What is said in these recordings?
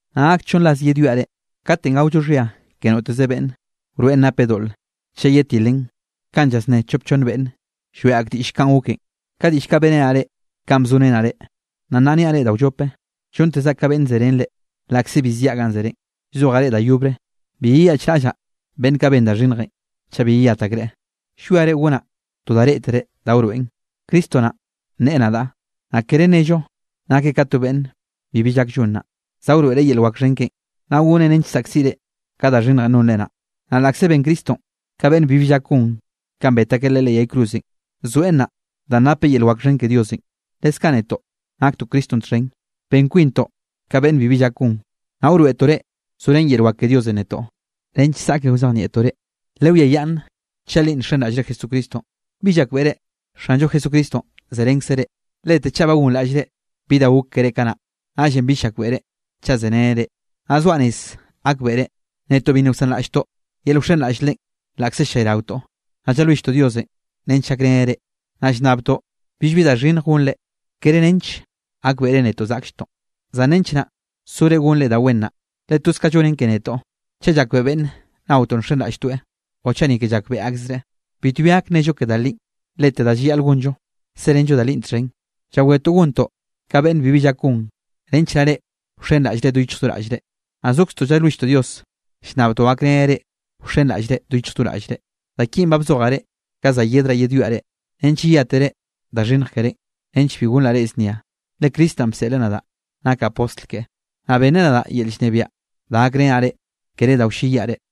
Nnaꞌ gak chonn ras yedwiaꞌ reꞌ. Katenꞌ gaollo xhia ke noteze beꞌnne, wroeꞌn napeꞌ doꞌle chaꞌ yetilen kanꞌ llasné chop chonn beꞌnne lloeꞌ ak diꞌll kanꞌ goken. Ka diꞌll kaꞌ beꞌrenaꞌ reꞌ kanꞌ bzorenaꞌ reꞌ, naꞌ nnaꞌ niaꞌ reꞌ da wllope, llontezaꞌ ka beꞌnn zerén reꞌ. Laꞌkze bi ziaꞌ ganꞌ zerenꞌ, llzojaꞌ reꞌ da yobre, bi yeyaꞌchraꞌllaꞌ beꞌnn kaꞌ ben da xhinnjenꞌ chaꞌ bi yeyat akreꞌ. Llwiare gonaꞌ to da reꞌtere da wroeꞌn, Cristo naꞌ nneꞌe nadaꞌ. Naꞌ kere nnello nakeꞌ ka to beꞌnn bibi llak llon naꞌ. Za wroeꞌreꞌ yel wak xhen keꞌen, naꞌ goneꞌ nench saꞌkziꞌre ka da xhinnjenꞌ nonre naꞌ. Naꞌ laꞌkze ben Cristonꞌ ka beꞌnn bibi llak gon kanꞌ bet akeꞌ Leꞌe leꞌ yay cruzenꞌ, zoeꞌ nnaꞌ danꞌ napeꞌ yel wak xhen ke Diosenꞌ. Leskaꞌ netoꞌ naktoꞌ Cristonꞌ txhen, ben kwintoꞌ ka beꞌnn bibi llak gon, naꞌ wroeꞌtoꞌ reꞌ zorén yel wak ke Diosenꞌ netoꞌ nench zaꞌke wzeniaꞌnaꞌtoꞌ reꞌ. Lewiayaꞌnn chaꞌ li nxenraꞌllre Jesucristonꞌ. ¿Bi llakbeꞌre Xanllo Jesucristonꞌ zerenkzeꞌ reꞌ? Lete chaꞌ ba gonraꞌllre bi da gok keré kanaꞌn, naꞌllenꞌ bill llakbeꞌre chaꞌ zereneꞌ reꞌ. Naꞌ zoaꞌ rez gakbeꞌre, netoꞌ bi nna wsanraꞌlltoꞌ yel wxenraꞌll Leꞌen laꞌkze ll-llayraotoꞌ. Naꞌ llalwilltoꞌ Diosenꞌ nench gakreneꞌ reꞌ, naꞌ llnnabtoꞌ billbi da xhinnj gonre, kere nench gakbeꞌre netoꞌ zaꞌklltoꞌ, zan nench naꞌ sore gonre da wen naꞌ. Le toz ka llonen ke netoꞌ, chaꞌ llayakbeꞌe beꞌnne naotoꞌ nxenraꞌlltoeꞌ o chaꞌ ni ke llakbeꞌe akzreꞌ. Bitbi gak nnello ke da linꞌ, lete da llayaꞌl gonllo serenllo da linꞌ txhen. Llawetoꞌ gontoꞌ ka beꞌnn bibi llak gon, nench naꞌ reꞌ wxenraꞌllre do yichj do raꞌllre. Naꞌ zokztoꞌ llalwilltoꞌ Dios, llnnabtoꞌ gakreneꞌ reꞌ wxenraꞌllre do yichj do raꞌllre. Da kinꞌ ba bzojaꞌ reꞌ ka za yedraꞌ yedwiaꞌ reꞌ, nench yeyátere da xhinnj kerénꞌ, nench bi gonraꞌ reꞌ znia. Le Cristo naꞌn bseꞌl nadaꞌ nakaꞌ postl keꞌe, naꞌ benneꞌ nadaꞌ yel llnebiaꞌ da gakrenaꞌ reꞌ, kere da wlleyiaꞌ reꞌ.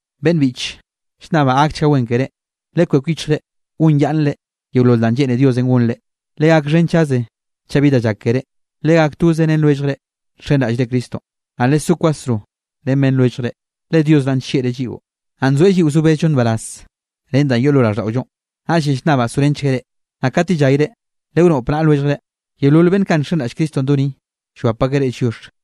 Beꞌnn biꞌche, llnnabaꞌ gakchga wen keré. Lekwek yichjre gonyaꞌnnre yeolol danꞌ lleꞌne Diosenꞌ gonre. Legakxhenchaze chaꞌ bi da llak keré. Legak toze ren lwelljre nxenraꞌllre Cristonꞌ, naꞌ lesó kwasro ren beꞌnn lwelljre. Le Dios naꞌn nllieꞌreꞌ lliꞌo, naꞌ nzoeꞌ lliꞌo zo bezllo nbaraz ren da yoꞌ lo raꞌlldaꞌollo, naꞌllenꞌ llnnabaꞌ sorenchgueꞌ reꞌ. Naꞌ kat yellayre lewnoꞌp naꞌa lwelljre. Yeolol beꞌnn kaꞌ nxenraꞌll Cristonꞌ do ni, llwap akeꞌ reꞌ lliox.